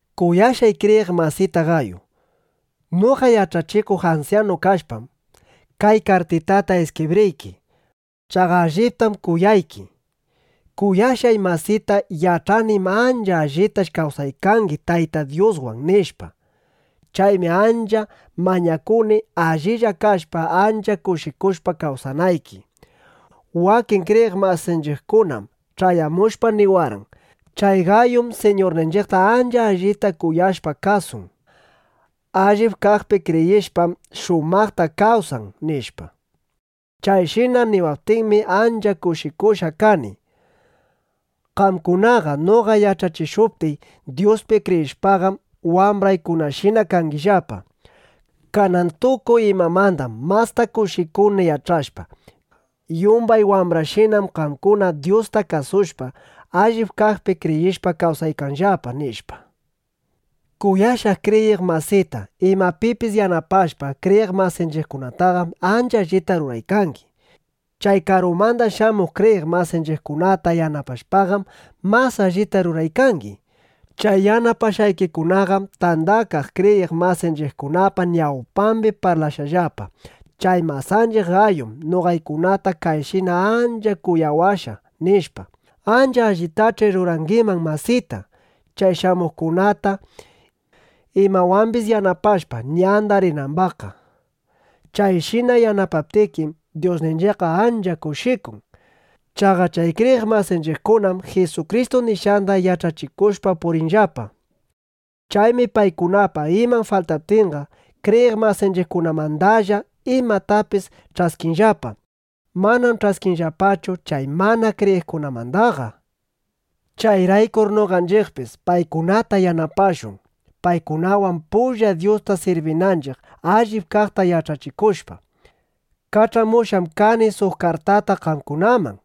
Kuyashqay kriyiq masita Gayu, noqa yach'achikuq ansyanu kashpam, kay kartitata iskibriyki. Chaqa alliptam kuyayki. Kuyashqay masita, yach'anim, ancha allitash kawsaykangi Tayta Dyuswan, nishpa. Chaymi ancha mañakuni, allilla kashpa, ancha kushikushpa kawsanayki. Wakin kriyiq masinchiqkunam ch'ayamushpa, niwarqan: Chay Gayum Siñurninchiqta ancha allita kuyashpa, kasun. Allip kaqpi kriyishpam, shumaqta kawsan, nishpa. Chayshina niwaptinmi, ancha kushikushqa kani. Qamkunaqa noqa yach'achishuptiy Dyuspi kriyishpaqam, wambraykunashina kangillapa. Kanan tukuy imamandam masta kushikuni yach'ashpa: Yumbay wambrayshina kaqkunam Dyusta kasushpa, allip kaqpi kriyishpa, kawsaykanllapa, nishpa. Kuyashqay kriyiq masita, imapipis yanapashpa kriyiq masinchiqkunataqam, ancha allita ruraykangi. Chay karumanda shamuq kriyiq masinchiqkunata yanapashpaqam, mas allita ruraykangi. Chay yanapashqaykikunaqam tandakaq kriyiq masinchiqkunapa ñawpambi parlashqallapa: Chay masanchiq Gayum noqaykunata kayshina ancha kuyawashqa, nishpa. Ancha allitach'i rurangiman masita, chay shamuqkunata imawambis yanapashpa, ñanda rinambaqqa. Chayshina yanapaptikim, Dyusninchiqqa ancha kushikun. Chaqa chay kriyiq masinchiqkunam Jisukristu nishqanda yach'achikushpa puriykanllapa. Chaymi paykunapa iman faltaptinqa, kriyiq masinchiqkunamandalla imatapis ch'askinllapa. Manam ch'askinllapachu chay mana kriyiqkunamandaqa. Chayraykur noqanchiqpis paykunata yanapashun, paykunawan pulla Dyusta sirbinanchiq, allip kaqta yach'achikushpa. Kach'amushqam kani suq kartata qamkunaman.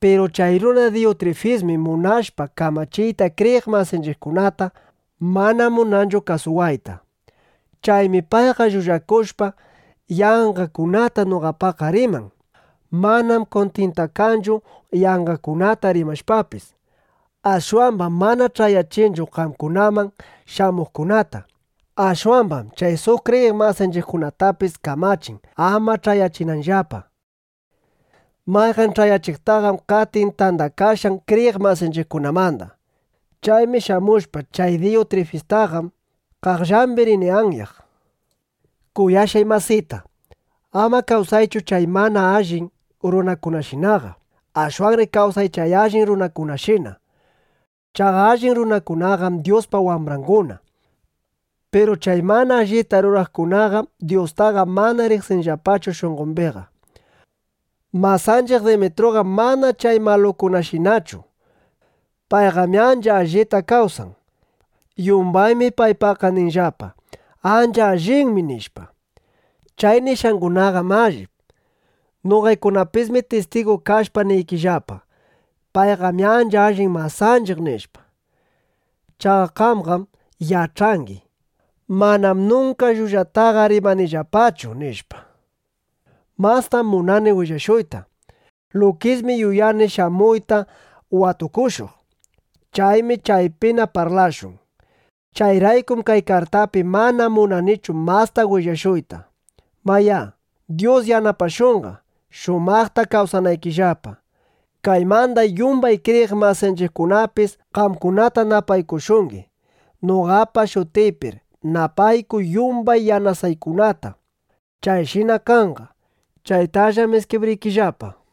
Piru chay runa Diyutrifismi munashpa kamachiyta kriyiq masinchiqkunata, mana munanchu kasuwayta. Chaymi payqa llullakushpa, yanqakunata noqapaqqa riman. Manam kuntintakanchu yanqakunata rimashpapis. Ashwambam mana ch'ayachinchu qamkunaman shamuqkunata. Ashwambam chay suq kriyiq masinchiqkunatapis kamachin, ama ch'ayachinanllapa. Mayqan ch'ayachiqtaqam qatin tandakashqan kriyiq masinchiqkunamanda. Chaymi shamushpa, chay Diyutrifistaqa qaqllambi rini anyaq. Kuyashqay masita, ama kawsaychu chay mana allin runakunashinaqa. Ashwanri kawsay chay allin runakunashina. Chaqa allin runakunaqam Dyuspa wambranguna. Piru chay mana allita ruraqkunaqam Dyustaqa mana riqsinllapachu shunqombiqa. Masanchiq Demetruqam mana chay malukunashinachu. Payqam ancha allita kawsan. Yumbaymi paypaqqa ninllapa: “Ancha allinmi” nishpa. Chay nishqangunaqam allip. Noqaykunapismi tistigu kashpa niykillapa: “Payqam ancha allin masanchiq”, nishpa. Chaqa qamqam yach'angi: Manam nunka llullataqa rimanillapachu, nishpa. Mastam munani willashuyta. Lukismi yuyani shamuyta watukushuq. Chaymi chaypina parlashun. Chayraykum kay kartapi mana munanichu masta willashuyta. Mayá, Dyus yanapashunqa, shumaqta kawsanaykillapa. Kaymanda yumbay kriyiq masinchiqkunapis qamkunata napaykushungi. Noqapa shutiypir napaykuy yumbay yanasuykunata (yanasaykunata). Chayshina kanqa. (Chaytallam iskibriykillapa.)